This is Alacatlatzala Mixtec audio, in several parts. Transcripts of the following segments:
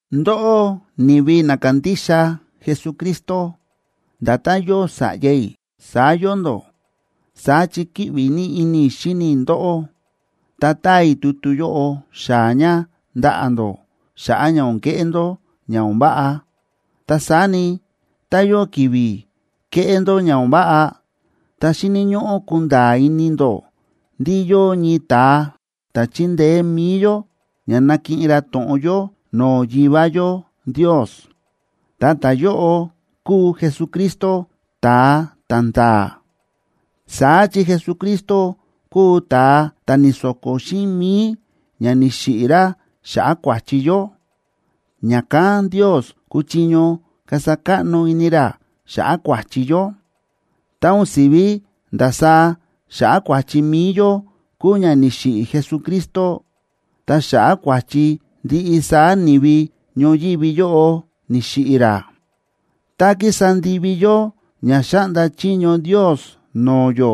Ndóꞌó, ni̱vi na kándixa Jesucristo, nda̱tán yóo sa̱ꞌya i̱, saá yóo ndó, saá chi kíꞌvi ní ini i̱ xíni i̱ ndóꞌó. Ta táa i̱ tutu yóꞌo xaa̱ ña ndaꞌa̱ ndó xa̱ꞌa̱ ña o̱n keꞌé ndó ña o̱n váꞌa. Ta saá ni, tá yóo ki̱vi̱ kéꞌé ndó ña o̱n váꞌa, ta xíni̱ ñóꞌó kunda̱a̱ ini ndó ndí yóo ñii ta̱a ta̱ chíndeé mi̱i yó ña nákiꞌin ra to̱ꞌon yó no̱o̱ Yivá yó Ndios, ta ta̱yóꞌo kúu Jesucristo, ta̱a ta̱nda̱a̱. Saá chi Jesucristo kúu ta̱a ta̱ ni̱so̱ko̱ xíꞌin mi̱i ña ni̱xiꞌi̱ ra xa̱ꞌa̱ kua̱chi yó, ña̱kán Ndios kúchiño kasa káꞌno ini ra xa̱ꞌa̱ kua̱chi yó. Ta o̱n si̱ví ndasaá xa̱ꞌa̱ kua̱chi mi̱i yó kúu ña ni̱xiꞌi̱ Jesucristo, ta xa̱ꞌa̱ kua̱chi ndiꞌi saá ni̱vi ñoyívi yóꞌo ni̱xiꞌi̱ ra. Tá kísa ndivi yó ña xáꞌnda chiño Ndios no̱o̱ yó,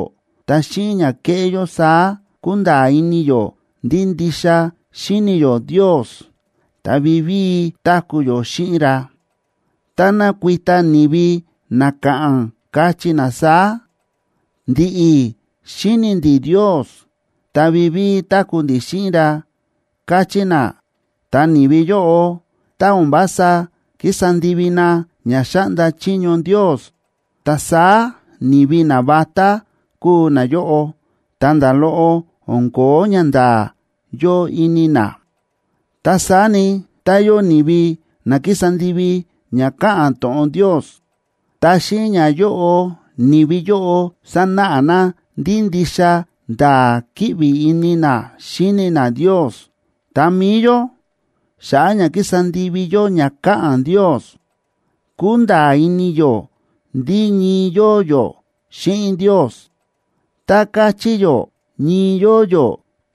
ta xíꞌin ña kéꞌé yó saá kúnda̱a̱ ini yó ndí ndixa xíni̱ yó Ndios, ta vivíi táku̱ yó xíꞌin ra. Tá nakuita ni̱vi na ka̱ꞌa̱n, kachí na saá: “Ndi̱ꞌi̱ xíni̱ ndi̱ Ndios, ta vivíi táku̱ ndi̱ xíꞌin ra”, kachí na, ta ni̱vi yóꞌo, tá o̱n vása kísa ndivi na ña xáꞌnda chiño Ndios, ta saá ni̱vi navatá kúu nayóꞌo, ta nda̱ loꞌo o̱n ko̱ó ñanda̱a̱ yóo ini na. Ta saá ni, tá yóo ni̱vi na kísa ndivi ña káꞌa̱n to̱ꞌon Ndios, ta xíꞌin ñayóꞌo ni̱vi yóꞌo sánáꞌa na ndí ndixa nda̱a̱ kíꞌvi ini na xíni na Ndios. Ta mi̱i yó, xa̱ꞌa̱ ña kísa ndivi yó ña káꞌa̱n Ndios, kúnda̱a̱ ini yó ndí ñii yóo yó xíꞌin Ndios. Tá káchí yó ñii yóo yó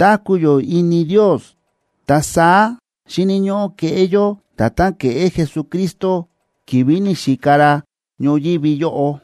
táku̱ yó ini Ndios, ta saá xíni̱ ñóꞌó keꞌé yó nda̱tán ke̱ꞌé Jesucristo ki̱vi̱ ni̱xika ra ñoyívi yóꞌo.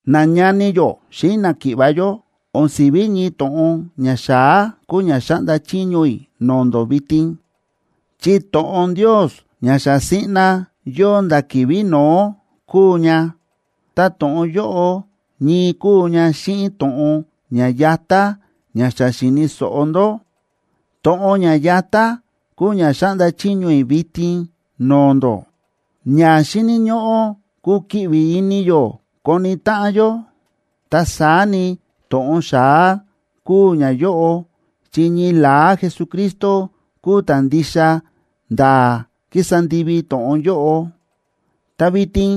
Nañani yó xíꞌin náki̱ꞌva̱ yó, o̱n si̱ví ñii to̱ꞌon ña xa̱á kúu ña xáꞌnda chiño i̱ no̱o̱ ndó vitin, chi to̱ꞌon Ndios ña xa siꞌna yóo nda̱ ki̱vi̱ no̱ó kúu ña. Ta to̱ꞌon yóꞌo ñii kúu ña xíꞌin to̱ꞌon ña yatá ña xa xi̱ni̱ so̱ꞌo ndó. To̱ꞌon ña yatá kúu ña xáꞌnda chiño i̱ vitin no̱o̱ ndó, ña xíni̱ ñóꞌó kukiꞌvi ini yó koni táꞌan yó. Ta saá ni, to̱ꞌon xa̱á kúu ñayóꞌo, chi ñii la̱á Jesucristo kúu ta̱ ndixa nda̱a̱ ki̱sa ndivi to̱ꞌon yóꞌo. Ta vitin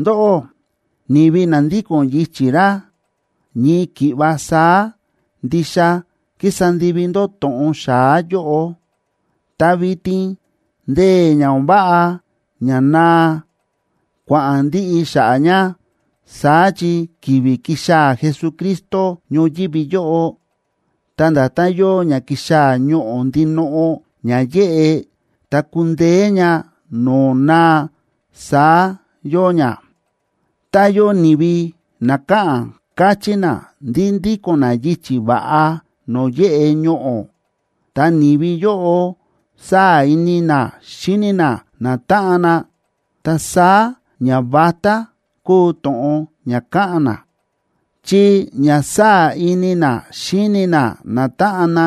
ndóꞌó, ni̱vi na ndíko̱n yichi̱ ra, ñii ki̱ꞌva saá ndixa kísa ndivi ndó to̱ꞌon xa̱á yóꞌo. Ta vitin ndee̱ ña o̱n váꞌa ña naa, kua̱ꞌa̱n ndiꞌi xa̱ꞌa̱ ña, saá chi ki̱vi̱ ki̱xaa̱ Jesucristo ñoyívi yóꞌo, ta nda̱tán yóo ña ki̱xaa̱ ñoꞌo̱ ndinoꞌo ña yéꞌe, ta kúndeé ña no̱o̱ naa, saá yóo ña. Tá yóo ni̱vi na káꞌa̱n, káchí na ndí ndíko̱n na yichi̱ va̱ꞌa no̱o̱ yéꞌe ñoꞌo̱, ta ni̱vi yóꞌo sáa̱ ini na xíni na natáꞌan na, ta saá ñavatá kúu to̱ꞌon ña káꞌa̱n na, chi ña sáa̱ ini na xíni na natáꞌan na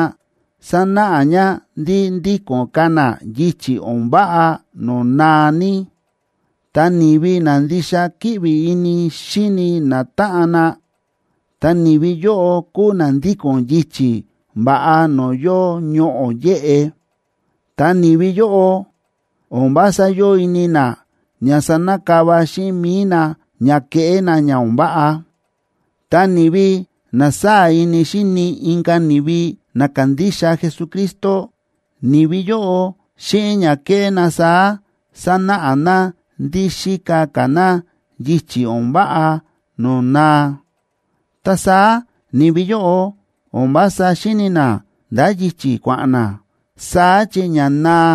sánáꞌa ña ndí ndíko̱n ka̱ na yichi̱ o̱n váꞌa no̱o̱ naa ní. Ta ni̱vi na ndixa kíꞌvi ini xíni natáꞌan na, ta ni̱vi yóꞌo kúu na ndíko̱n yichi̱ va̱ꞌa no̱o̱ yóo ñoꞌo̱ yéꞌe. Ta ni̱vi yóꞌo, o̱n vása yóo ini na ña sanakava xíꞌin mi̱i na ña keꞌé na ña o̱n váꞌa. Ta ni̱vi na sáa̱ ini xíni inka̱ ni̱vi na kándixa Jesucristo, ni̱vi yóꞌo, xíꞌin ña kéꞌé na saá sánáꞌa na ndí xíka ka̱ na yichi̱ o̱n váꞌa no̱o̱ naa. Ta saá ni̱vi yóꞌo o̱n vása xíni̱ na ndá yichi̱ kua̱ꞌa̱n na, saá chi ña naa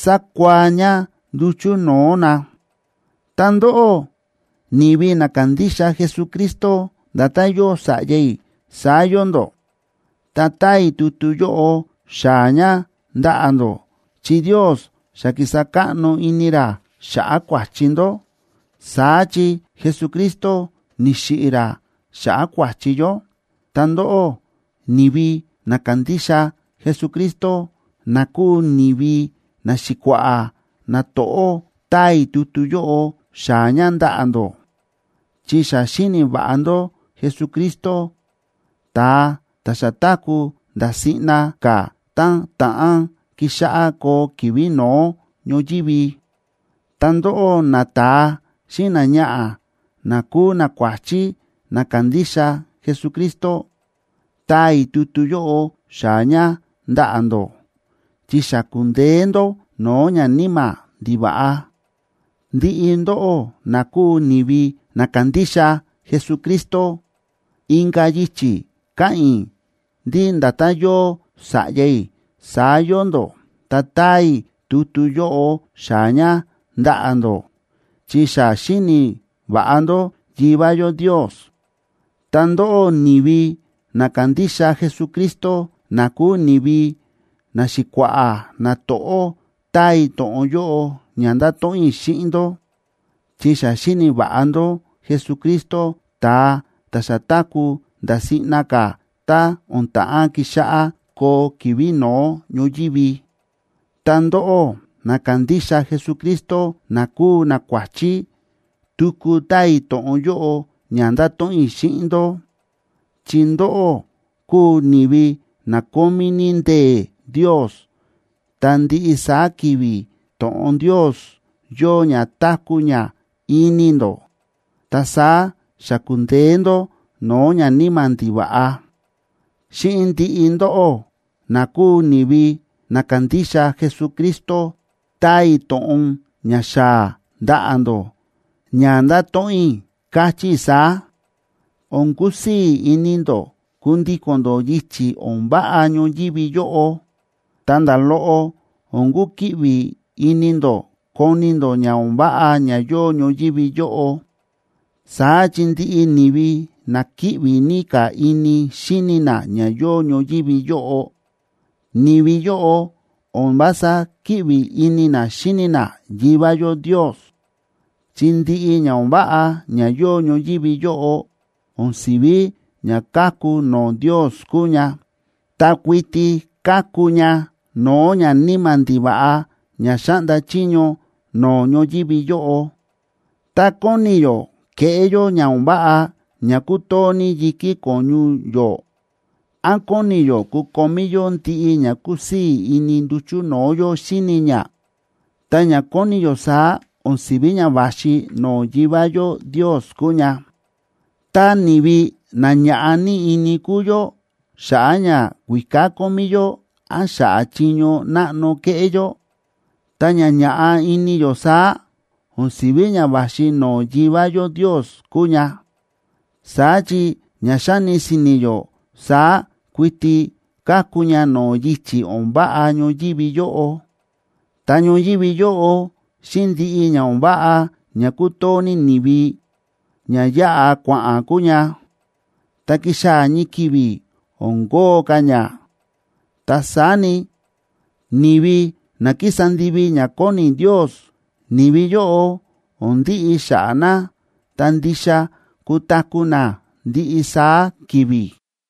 sákua̱á ña nduchu̱ no̱o̱ na. Ta ndóꞌó, ni̱vi na kándixa Jesucristo, nda̱tán yóo sa̱ꞌya i̱, saá yóo ndó, ta táa i̱ tutu yóꞌo xaa̱ ña ndaꞌa̱ ndó, chi Ndios xa ki̱sa káꞌno ini ra xa̱ꞌa̱ kua̱chi ndó, saá chi Jesucristo ni̱xiꞌi̱ ra xa̱ꞌa̱ kua̱chi yó. Ta ndóꞌó, ni̱vi na kándixa Jesucristo, na kúu ni̱vi naxi̱kua̱ꞌa̱ nato̱ꞌó, táa i̱ tutu yóꞌo xaa̱ ña ndaꞌa̱ ndó, chi xa xíni̱ va̱ꞌa ndó Jesucristo, ta̱a ta̱ xa táku̱ nda̱ siꞌna ka̱ tá ta̱ꞌán kixáꞌá koo ki̱vi̱ no̱ó ñoyívi. Ta ndóꞌó, nata̱a xíꞌin náñaꞌa̱ na kúu nakuáchí na kándixa Jesucristo, táa i̱ tutu yóꞌo xaa̱ ña ndaꞌa̱ ndó, chi xa ku̱ndeé ndó no̱o̱ ñaníma̱ ndiva̱ꞌa. Ndiꞌi ndóꞌó na kúu ni̱vi na kándixa Jesucristo, inka̱ yichi̱ káꞌa̱n i̱ ndí nda̱tán yóo sa̱ꞌya i̱, saá yóo ndó, ta táa i̱ tutu yóꞌo xaa̱ ña ndaꞌa̱ ndó, chi xa xíni̱ va̱ꞌa ndó Yivá yó Ndios. Ta ndóꞌó, ni̱vi na kándixa Jesucristo, na kúu ni̱vi naxi̱kua̱ꞌa̱ nato̱ꞌó, táa i̱ to̱ꞌon yóꞌo ña ndáto̱ꞌon i̱ xíꞌin ndó, chi xa xíni̱ va̱ꞌa ndó Jesucristo, ta̱a ta̱ xa táku̱ nda̱ siꞌna ka̱ tá o̱n ta̱ꞌán kixáꞌá koo ki̱vi̱ no̱ó ñoyívi. Ta ndóꞌó, na kándixa Jesucristo, na kúu nakuáchí, tuku táa i̱ to̱ꞌon yóꞌo ña ndáto̱ꞌon i̱ xíꞌin ndó, chi ndóꞌó kúu ni̱vi na kómí ní ndee̱ Ndios, ta ndiꞌi saá ki̱vi̱ to̱ꞌon Ndios yóo ña táku̱ ña ini ndó, ta saá xa ku̱ndeé ndó no̱o̱ ñaníma̱ ndiva̱ꞌa. Xíꞌin ndiꞌi ndóꞌó, na kúu ni̱vi na kándixa Jesucristo, táa i̱ to̱ꞌon ña xaa̱ ndaꞌa̱ ndó, ña ndáto̱ꞌon i̱, káchí i̱ saá: O̱n kusii̱ ini ndó kundíko̱n ndó yichi̱ o̱n váꞌa ñoyívi yóꞌo, ta nda̱ loꞌo o̱n kukiꞌvi ini ndó koni ndó ña o̱n váꞌa ña yóo ñoyívi yóꞌo. Saá chi ndiꞌi ni̱vi na kíꞌvi ní ka̱ ini xíni na ña yóo ñoyívi yóꞌo, ni̱vi yóꞌo o̱n vása kíꞌvi ini na xíni na Yivá yó Ndios. Chi ndiꞌi ña o̱n váꞌa ña yóo ñoyívi yóꞌo o̱n si̱ví ña káku no̱o̱ Ndios kúu ña, ta kuiti káku ña no̱o̱ ñaníma̱ ndiva̱ꞌa ña xáꞌnda chiño no̱o̱ ñoyívi yóꞌo. Tá kóni yó keꞌé yó ña o̱n váꞌa ña kútoo ní yi̱kí ko̱ñu yó, án kóni yó kukomí yó ndiꞌi ña kúsii̱ ini nduchu̱ no̱o̱ yó xíni ña, ta ña kóni yó saá o̱n si̱ví ña va̱xi no̱o̱ Yivá yó Ndios kúu ña. Tá ni̱vi na ña̱ꞌa ní ini kúu yó xa̱ꞌa̱ ñakuíká kómí yó án xa̱ꞌa̱ chiño náꞌno kéꞌé yó, ta ña ña̱ꞌa ini yó saá, o̱n si̱ví ña va̱xi no̱o̱ Yivá yó Ndios kúu ña. Saá chi ña xáni si̱ni̱ yó saá kuiti káku ña no̱o̱ yichi̱ o̱n váꞌa ñoyívi yóꞌo. Ta ñoyívi yóꞌo xíꞌin ndiꞌi ña o̱n váꞌa ña kútoo ní ni̱vi, ña yáꞌa kua̱ꞌa̱n kúu ña, ta kixaa̱ ñii ki̱vi̱ o̱n kóo ka̱ ña. Ta saá ni, ni̱vi na kísa ndivi ña kóni Ndios, ni̱vi yóꞌo o̱n ndiꞌi xa̱ꞌa̱ na, ta ndixa kutaku̱ na ndiꞌi saá ki̱vi̱.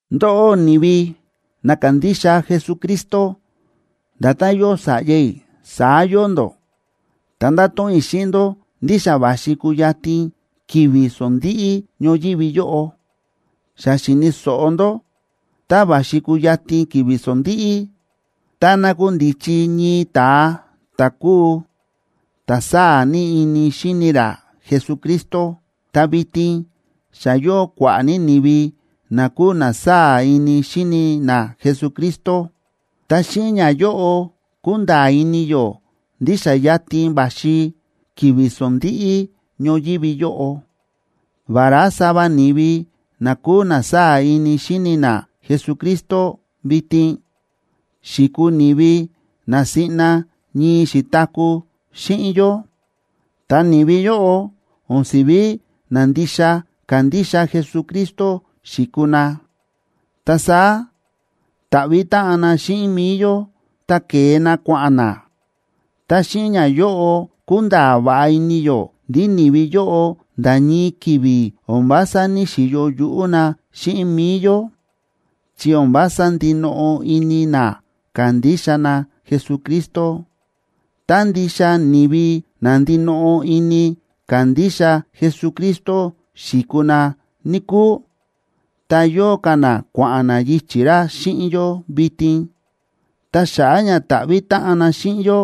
Ndóꞌó, ni̱vi na kándixa Jesucristo, nda̱tán yóo sa̱ꞌya i̱, saá yóo ndó, ta ndáto̱ꞌon i̱ xíꞌin ndó ndí xa va̱xi kuyatin ki̱vi̱ sondíꞌí ñoyívi yóꞌo. Xa xi̱ni̱ so̱ꞌo ndó tá va̱xi kuyatin ki̱vi̱ sondíꞌí, ta nakundichi ñii ta̱a ta̱ kúu ta̱ sáa̱ ní ini xíni ra Jesucristo, ta vitin xa yóo kua̱ꞌa̱ ní ni̱vi na kúu na sáa̱ ini xíni na Jesucristo. Ta xíꞌin ñayóꞌo kúnda̱a̱ ini yó ndí xa yatin va̱xi ki̱vi̱ sondíꞌí ñoyívi yóꞌo. Vará sava ni̱vi na kúu na sáa̱ ini xíni na Jesucristo vitin, xi̱kuu ni̱vi na siꞌna ñii xi̱taku̱ xíꞌin yó, ta ni̱vi yóꞌo o̱n si̱ví na ndixa kándixa Jesucristo xi̱kuu na. Ta saá ni̱ta̱ꞌvi̱ táꞌan na xíꞌin mi̱i yó, ta ke̱e na kua̱ꞌa̱n na. Ta xíꞌin ñayóꞌo kúnda̱a̱ va̱ꞌa ini yó ndí ni̱vi yóꞌo nda̱ ñii ki̱vi̱ o̱n vása ní‑xiyo yuꞌú na xíꞌin mi̱i yó, chi o̱n vása ndinoꞌo ini na kándixa na Jesucristo. Tá ndixa ni̱vi na ndinoꞌo ini kándixa Jesucristo xi̱kuu na, níkúu, ta yóo ka̱ na kua̱ꞌa̱n na yichi̱ ra xíꞌin yó vitin. Ta xa̱ꞌa̱ ña ni̱ta̱ꞌvi̱ táꞌan na xíꞌin yó,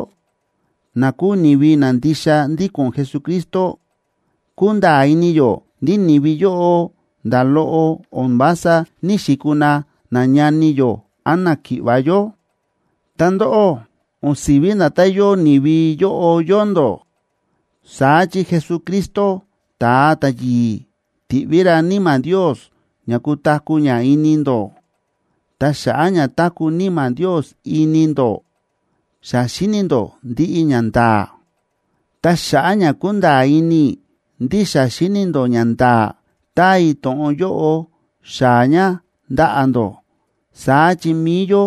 na kúu ni̱vi na ndixa ndíko̱n Jesucristo, kúnda̱a̱ ini yó ndí ni̱vi yóꞌo nda̱ loꞌo o̱n vása ní‑xikuu na nañani yó án náki̱ꞌva̱ yó. Ta ndóꞌó, o̱n si̱ví nda̱tán yóo ni̱vi yóꞌo yóo ndó. Saá chi Jesucristo, ta̱a ta̱yi̱i̱, ti̱ꞌví ra Níma̱ Ndios ña kutaku̱ ña ini ndó. Ta xa̱ꞌa̱ ña táku̱ Níma̱ Ndios ini ndó, xa xíni̱ ndó ndiꞌi ñanda̱a̱. Ta xa̱ꞌa̱ ña kúnda̱a̱ ini i̱ ndí xa xíni̱ ndó ñanda̱a̱, táa i̱ to̱ꞌon yóꞌo xaa̱ ña ndaꞌa̱ ndó. Saá chi mi̱i yó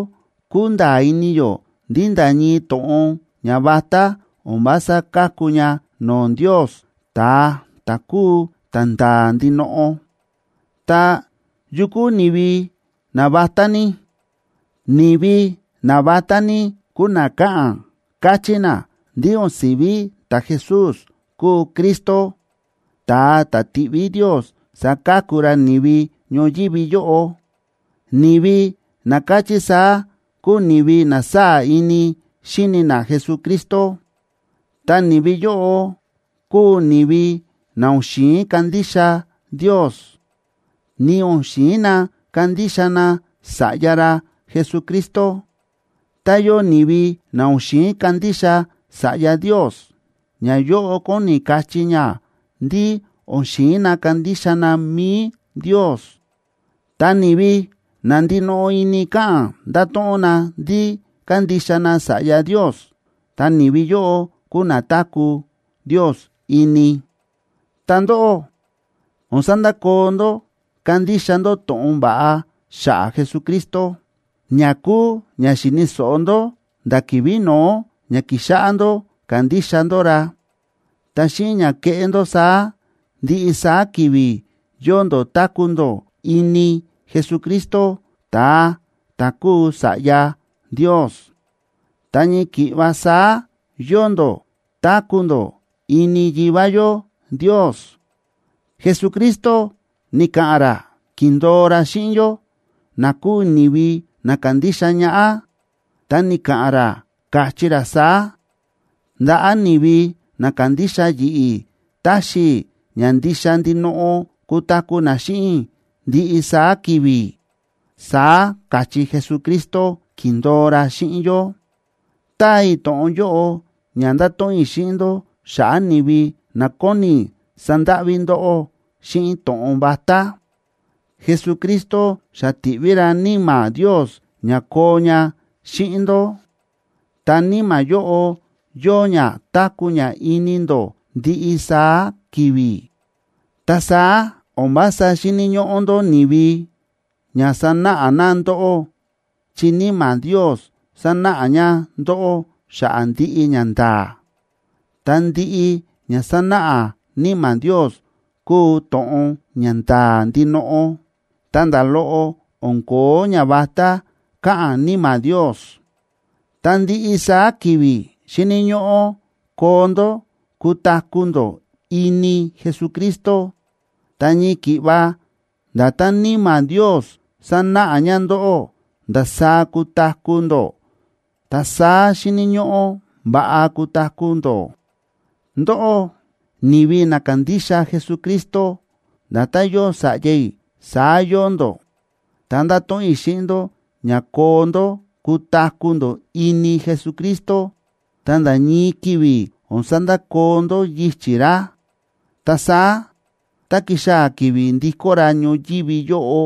kúnda̱a̱ ini yó ndí nda̱ ñii to̱ꞌon ñavatá o̱n vása káku ña no̱o̱ Ndios, ta̱a ta̱ kúu ta̱nda̱a̱ ndinoꞌo. Ta, ¿yu kúu ni̱vi navatá ní? Ni̱vi navatá ní kúu na káꞌa̱n, káchí na ndí o̱n si̱ví ta̱Jesús kúu Cristo, ta̱a ta̱ ti̱ꞌví Ndios saka̱ku ra ni̱vi ñoyívi yóꞌo. Ni̱vi na káchí saá kúu ni̱vi na sáa̱ ini xíni na Jesucristo. Ta ni̱vi yóꞌo kúu ni̱vi na o̱n xi̱in kandixa Ndios, ni o̱n xi̱in na kandixa na Sa̱ꞌya ra Jesucristo. Tá yóo ni̱vi na o̱n xi̱in kandixa Sa̱ꞌya Ndios, ñayóꞌo kóni kachí ña ndí o̱n xi̱in na kandixa na mi̱i Ndios. Ta ni̱vi na ndinoꞌo ini káꞌa̱n ndáto̱ꞌon na ndí kándixa na Sa̱ꞌya Ndios, ta ni̱vi yóꞌo kúu na táku̱ Ndios ini. Ta ndóꞌó, o̱n sandakoo ndó kándixa ndó to̱ꞌon va̱ꞌa xa̱ꞌa̱ Jesucristo, ña kúu ña xi̱ni̱ so̱ꞌo ndó nda̱ ki̱vi̱ no̱ó ña ki̱xáꞌá ndó kándixa ndó ra. Ta xíꞌin ña keꞌé ndó saá, ndiꞌi saá ki̱vi̱ yóo ndó táku̱ ndó ini Jesucristo, ta̱a ta̱ kúu Sa̱ꞌya Ndios, ta ñii ki̱ꞌva saá yóo ndó táku̱ ndó ini Yivá yó Ndios. Jesucristo ni̱ka̱ꞌa̱n ra, ki̱ndo̱o ra xíꞌin yó, na kúu ni̱vi na kándixa ñaꞌá, ta ni̱ka̱ꞌa̱n ra, káchí ra saá: “Ndaꞌa̱ ni̱vi na kándixa yi̱ꞌi̱ taxi i̱ ña ndixa ndinoꞌo kutaku̱ na xíꞌin i̱ ndiꞌi saá ki̱vi̱”, saá káchí Jesucristo, ki̱ndo̱o ra xíꞌin yó. Táa i̱ to̱ꞌon yóꞌo ña ndato̱ꞌon i̱ xíꞌin ndó xa̱ꞌa̱ ni̱vi na kóni sandáꞌví ndóꞌó xíꞌin to̱ꞌon vatá. Jesucristo xa ti̱ꞌví ra Níma̱ Ndios ña koo ña xíꞌin ndó, ta Níma̱ yóꞌo yóo ña táku̱ ña ini ndó ndiꞌi saá ki̱vi̱. Ta saá o̱n vása xíni̱ ñóꞌó ndó ni̱vi ña sanáꞌa na ndóꞌó, chi Níma̱ Ndios sánáꞌa ña ndóꞌó xa̱ꞌa̱ ndiꞌi ñanda̱a̱. Ta ndiꞌi ña sánáꞌa Níma̱ Ndios kúu to̱ꞌon ña nda̱a̱ ndinoꞌo, ta nda̱ loꞌo o̱n ko̱ó ñavatá káꞌa̱n Níma̱ Ndios. Ta ndiꞌi saá ki̱vi̱ xíni̱ ñóꞌó koo ndó kutaku̱ ndó ini Jesucristo. Ta ñii ki̱ꞌva nda̱tán Níma̱ Ndios sánáꞌa ña ndóꞌó ndasaá kutaku̱ ndó, ta saá xíni̱ ñóꞌó va̱ꞌa kutaku̱ ndó. Ndóꞌó, ni̱vi na kándixa Jesucristo, nda̱tán yóo sa̱ꞌya i̱, saá yóo ndó, ta ndáto̱ꞌon i̱ xíꞌin ndó ña koo ndó kutaku̱ ndó ini Jesucristo, ta nda̱ ñii ki̱vi̱ o̱n sandakoo ndó yichi̱ ra. Ta saá tá kixaa̱ ki̱vi̱ ndikó ra ñoyívi yóꞌo,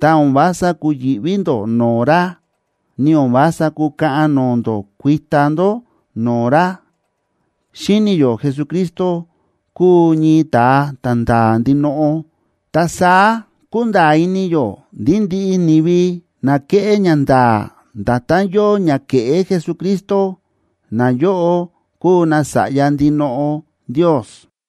ta o̱n vása kuyi̱ꞌví ndó no̱o̱ ra, ni o̱n vása kukaꞌan no̱o̱ ndó kuita ndó no̱o̱ ra. Xíni̱ yó Jesucristo kúu ñii ta̱a ta̱nda̱a̱ ndinoꞌo, ta saá kúnda̱a̱ ini yó ndí ndiꞌi ni̱vi na kéꞌé ñanda̱a̱ nda̱tán yóo ña ke̱ꞌé Jesucristo, nayóꞌo kúu nasa̱ꞌya ndinoꞌo Ndios.